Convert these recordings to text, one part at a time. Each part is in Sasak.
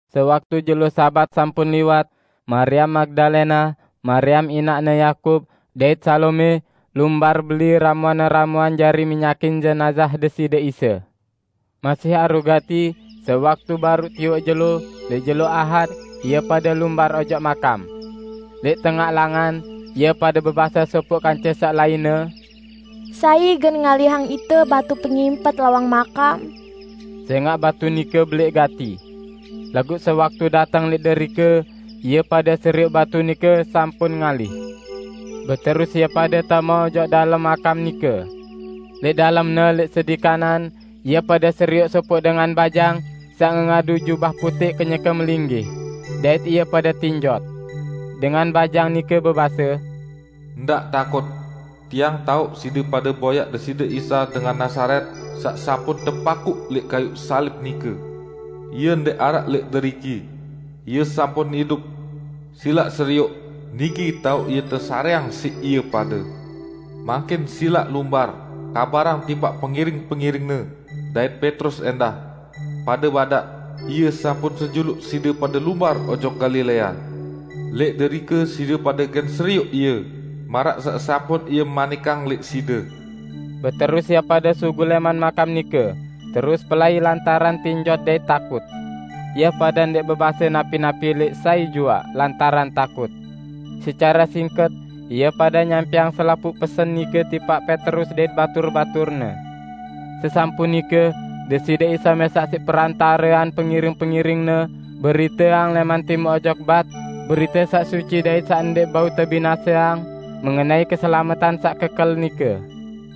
Sewaktu jelo Sabat sampun liwat, Mariam Magdalena, Mariam inaqne Yakub, dait Salome lumbar beli ramuan-ramuan jari minyakin jenazah Deside Isa. Masih aru gati sewaktu baruq tiwoq jelo, lẽq jelo Ahad, ie pade lumbar ojok makam. Lẽq tengaq langan ie pade bebase sopoq kance saq lainne, "Sai gen ngalihang ite batu pengimpet lawang makam?" Sẽngaq batu nike belẽq gati. Laguq sewaktu dateng lẽq derike ie pade serioq batu nike sampun ngalih. Beterus ie pade tame ojok dalem makam nike. Lẽq dalemne lẽq sedi kanan, ie pade serioq sopoq dengan bajang saq ngengadu jubah putẽq kenyeke melinggih, dait ie pade tinjot. Dengan bajang nike bebase, "Ndaq takut! Tiang taoq side pade boyaq Deside Isa dengan Nazaret saq sampun tepakuq lẽq kayuq salib nike. Ie ndẽq araq lẽq deriki. Ie sampun idup! Silaq serioq, niki taoq Ie tesarẽang siq ie pade. Mangkin silaq lumbar, kabarang tipaq pengiring-pengiring-Ne, dait Petrus ẽndah. Pade badaq, 'Ie sampun senjuluq side pade lumbar ojok Galilea. Lẽq derike side pade gen serioq Ie, maraq saq sampun Ie manikang lẽq side.' " Beterus ie pade sugul lẽman makam nike terus pelai lantaran tinjot dait takut. Ie pade ndẽq bebase napi-napi lẽq sai juaq lantaran takut. Secare singket ie pade nyampẽang selapuq pesen nike tipaq Petrus dait batur-baturne. Sesampun nike Deside Isa mẽsaq siq perantarean pengiring-pengiring-Ne beriteang lẽman Timuq ojok Bat berite saq suci dait saq ndẽq bau tebinaseang mengenai keselametan saq kekel nike.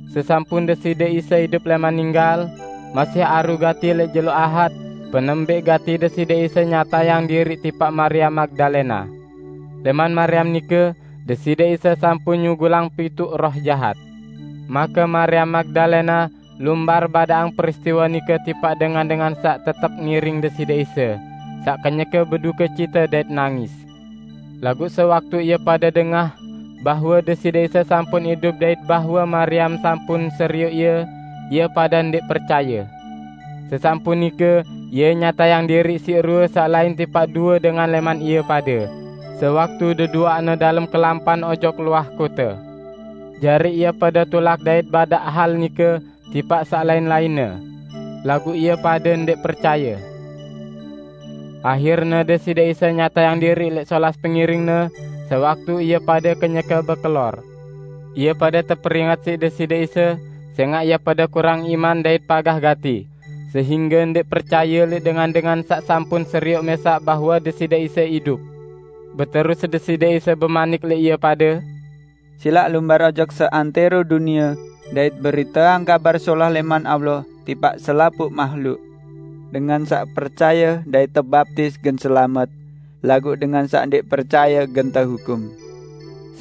Sesampun Deside Isa idup lẽman ninggal, masih aru gati lẽq jelo ahad, penembẽq gati Deside Isa nyatayang diriq tipaq Mariam Magdalena. Lẽman Mariam nike Deside Isa sampun nyugulang pituq roh jahat. Make Mariam Magdalena lumbar badaqang peristiwe nike tipaq dengan-dengan saq tetep ngiring Deside Isa, saq kenyeke bedukecite dait nangis. Laguq sewaktu ie pade dengah bahwe Deside Isa sampun idup dait bahwe Mariam sampun serioq Ie, ie pade ndẽq percaye. Sesampun nike Ie nyatayang diriq siq rue saq lain tipaq due dengan lẽman ie pade, sewaktu deduaqne dalem kelampan ojok luah kote. Jari ie pade tulak dait badaq hal nike tipaq saq lain-lainne. Laguq ie pade ndẽq percaye. Ahirne Deside Isa nyatayang diriq lẽq solas pengiring-Ne sewaktu ie pade kenyeke bekelor. Ie pade teperinget siq Deside Isa sẽngaq ie pade kurang iman dait pagah gati sehingge ndẽq percaye lẽq dengan-dengan saq sampun serioq mẽsaq bahwe Deside Isa idup. Beterus Deside Isa bemanik lẽq ie pade, "Silaq lumbar ojok seantẽro dunie dait beriteang Kabar Solah lẽman Allah tipaq selapuq mahluk. Dengan saq percaye dait tebaptis gen selamet, laguq dengan saq ndẽq percaye gen tehukum.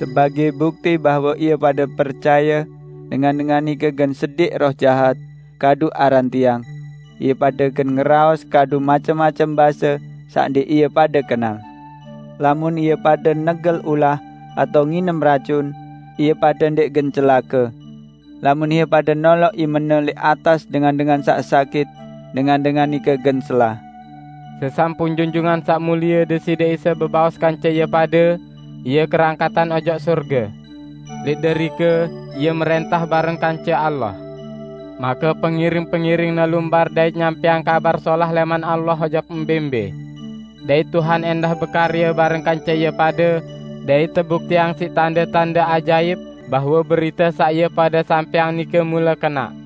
Sebagẽ bukti bahwe ie pade percaye, dengan-dengan nike gen sediq roh jahat kadu aran Tiang; ie pade gen ngeraos kadu macem-macem base saq ndẽq ie pade kenal. Lamun ie pade negel ulah atao nginem racun, ie pade ndẽq gen celake. Lamun ie pade noloq imene lẽq atas dengan-dengan saq sakit, dengan-dengan nike gen selah." Sesampun Junjungan Saq Mulie Deside Isa bebaos kance ie pade, Ie kerangkatan ojok sorge. Lẽq derike Ie mrẽntah bareng kance Allah. Make pengiring-pengiring-Ne lumbar dait nyampẽang Kabar Solah lẽman Allah ojok mbẽ-mbẽ. Dait Tuhan ẽndah bekarye bareng kance ie pade, dait tebuktiang siq tande-tande ajaip bahwe berite saq ie pade sampẽang nike mule kenaq.